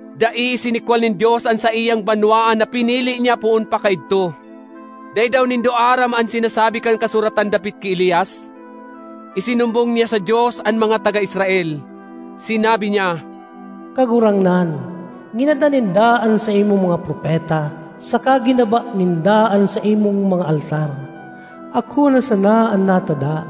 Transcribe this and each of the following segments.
Dai isinikwal nin Dios an saiyang banwaan na pinili niya poon pa kaidto. Dai daw nindo aram an sinasabi kan kasuratan dapit ki Elias? Isinumbong niya sa Dios an mga taga Israel. Sinabi niya, “Kagurangnan, ginadan ninda an saimong mga propeta saka ginaba ninda an saimong mga altar. Ako na sana an natada,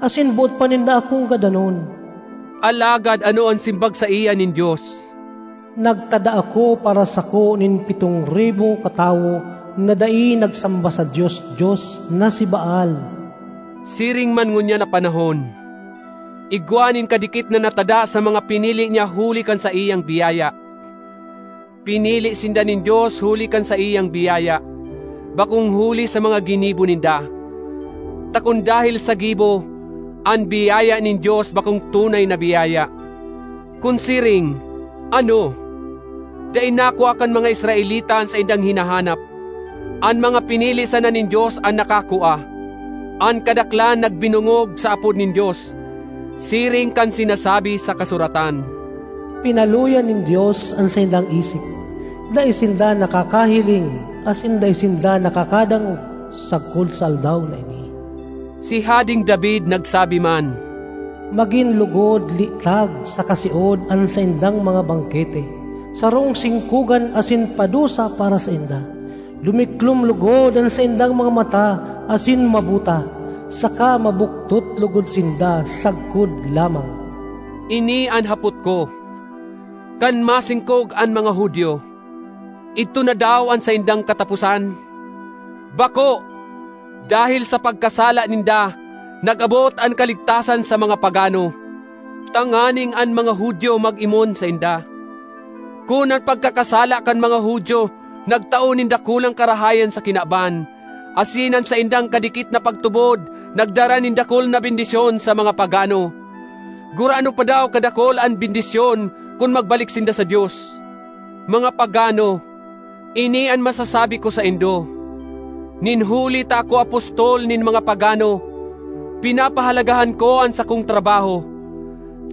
asin boot pa ninda akong gadanon.” Alagad ano an simbag saiya nin Dios? “Nagtada ako para sako nin pitong ribo katawo na dai nagsamba sa dios-dios na si Baal.” Siring man ngunyan na panahon: igwa nin kadikit na natada sa mga pinili niya huli kan saiyang biyaya. Pinili sinda nin Dios huli kan saiyang biyaya, bakong huli sa mga ginibo ninda; ta kun dahel sa gibo, an biyaya nin Dios bakong tunay na biyaya. Kun siring, ano? Dai nakua kan mga Israelita an saindang hinahanap. An mga pinili sana nin Dios an nakakua; an kadaklan nagbinongog sa apod nin Dios. Siring kan sinasabi sa kasuratan, “Pinaluya nin Dios an saindang isip; dai sinda nakakahiling asin dai sinda nakakadangog sagkod sa aldaw na ini.” Si Hadeng David nagsabi man, “Magin logod litag saka siod an saindang mga bangkete, sarong singkogan asin padusa para sainda. Dumiklom logod an saindang mga mata asin mabuta, saka mabuktot logod sinda sagkod lamang.” Ini an hapot ko: Kan masingkog an mga Judio, idto na daw an saindang kataposan? Bako! Dahel sa pagkasala ninda, nag-abot an kaligtasan sa mga pagano, tanganing an mga Judio mag-imon sainda. Kun an pagkakasala kan mga Judio nagtao nin dakulang karahayan sa kinaban, asin an saindang kadikit na pagtubod nagdara nin dakul na bendisyon sa mga pagano, gurano pa daw kadakul an bendisyon kun magbalik sinda sa Dios! Mga pagano, ini an masasabi ko saindo: Nin huli ta ako apostol nin mga pagano, pinapahalagahan ko an sakong trabaho,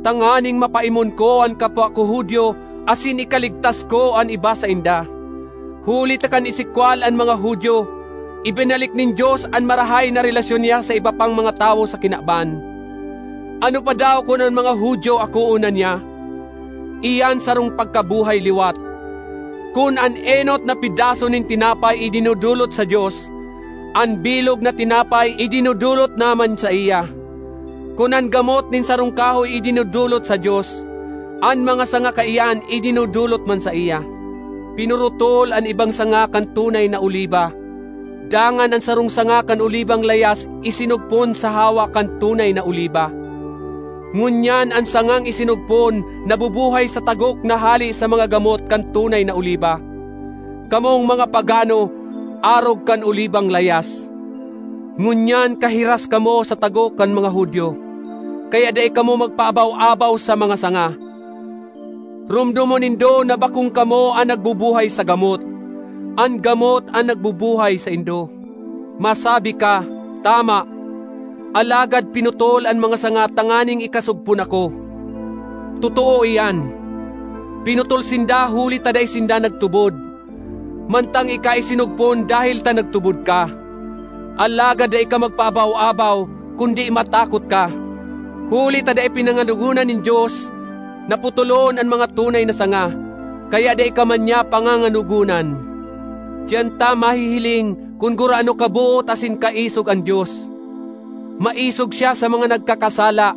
tanganing mapaimon ko an kapwa ko Judio asin ikaligtas ko an iba sainda. Huli ta kan isikwal an mga Judio, ibinalik nin Dios an marahay na relasyon niya sa iba pang mga tawo sa kinaban. Ano pa daw kun an mga Judio akoon na niya? Iyan sarong pagkabuhay liwat. Kun an enot na pedaso nin tinapay idinodolot sa Dios, an bilog na tinapay idinodolot na man saiya; kun an gamot nin sarong kahoy idinodolot sa Dios, an mga sanga kaiyan idinodolot man saiya. Pinurutol an ibang sanga kan tunay na oliba, dangan an sarong sanga kan olibang layas isinugpon sa hawak kan tunay na oliba. Ngunyan an sangang isinugpon nabubuhay sa tagok na hale sa mga gamot kan tunay na oliba. Kamong mga pagano arog kan olibang layas; ngunyan kahiras kamo sa tagok kan mga Judio. Kaya dai kamo magpaabaw-abaw sa mga sanga. Romdomon nindo na bakong kamo an nagbubuhay sa gamot; an gamot an nagbubuhay saindo. Masabi ka, “Tama, alagad pinutol an mga sanga tanganing ikasugpon ako.” Totoo iyan. Pinutol sinda huli ta dai sinda nagtubod, mantang ika isinugpon dahel ta nagtubod ka. Alagad dai ka magpaabaw-abaw, kundi matakot ka. Huli ta dai pinanganogonan nin Dios na putolon an mga tunay na sanga, kaya dai ka man niya panganganogonan. Diyan ta mahihiling kun gurano kaboot asin kaisog an Dios. Maisog siya sa mga nagkakasala,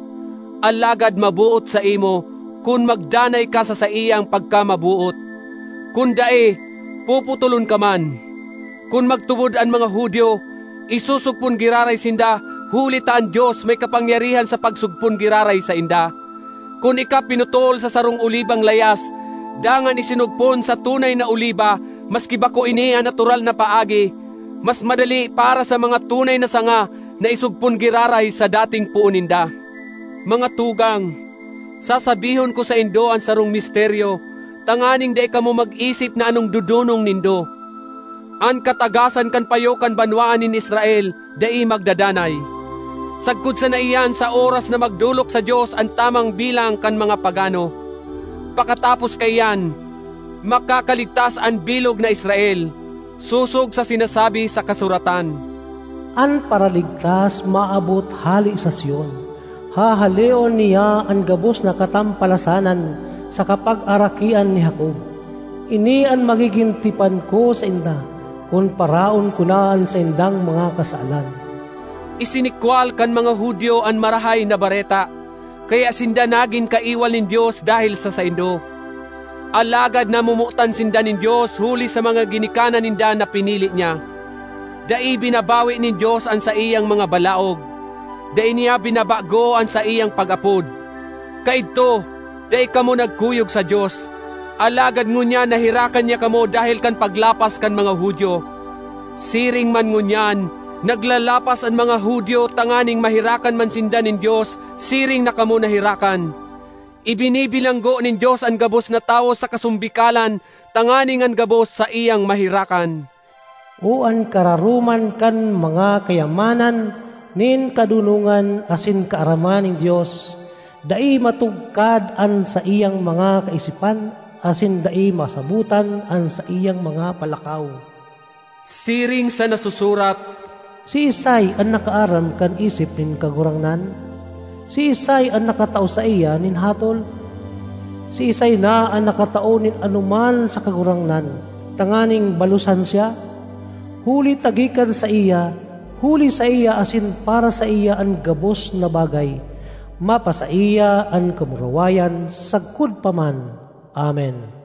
alagad maboot saimo—kun magdanay ka sa saiyang pagkamaboot. Kun dai, puputolon ka man. Kun magtubod an mga Judio, isusugpon giraray sinda huli ta an Dios may kapangyarihan sa pagsugpon giraray sainda. Kun ika pinutol sa sarong olibang layas, dangan isinugpon sa tunay na oliba maski bako ini an natural na paagi, mas madali para sa mga tunay na sanga na isugpon giraray sa dating poon ninda! Mga tugang, sasabihon ko saindo an sarong misteryo tanganing dai kamo mag-isip na anong dodonong nindo: an katagasan kan payo kan banwaan nin Israel dai magdadanay. Sagkod sana iyan sa oras na magdolok sa Dios an tamang bilang kan mga pagano. Pakatapos kaiyan, makakaligtas an bilog na Israel, sosog sa sinasabi sa kasuratan, “An Paraligtas maabot hale sa Sion; hahaleon niya an gabos na katampalasanan sa kapagarakian ni Jacob. Ini an magigin tipan ko sainda, kun paraon ko na an saindang mga kasalan.” Isinikwal kan mga Judio an Marahay na Bareta, kaya sinda nagin kaiwal nin Dios dahel sa saindo. Alagad namomotan sinda nin Dios huli sa mga ginikanan ninda na pinili niya. Dai binabawi nin Dios an saiyang mga balaog; dai niya binabago an saiyang pag-apod. Kaidto, dai kamo nagkuyog sa Dios, alagad ngunyan naherakan niya kamo dahel kan paglapas kan mga Judio. Siring man ngunyan, naglalapas an mga Judio tanganing maherakan man sinda nin Dios siring na kamo naherakan. Ibinibilanggo nin Dios an gabos na tawo sa kasombikalan tanganing an gabos saiyang maherakan. O an kararoman kan mga kayamanan nin kadonongan asin kaaraman nin Dios! Dai matugkad an saiyang mga kaisipan asin dai masabotan an saiyang mga palakaw! Siring sa nasusurat, “Siisay an nakaaram kan isip nin Kagurangnan? Siisay an nakatao saiya nin hatol? Siisay na an nakatao nin anoman sa Kagurangnan, tanganing balosan siya?” Huli ta gikan saiya, huli saiya asin para saiya an gabos na bagay. Mapasaiya an kamurawayan sagkod pa man. Amen.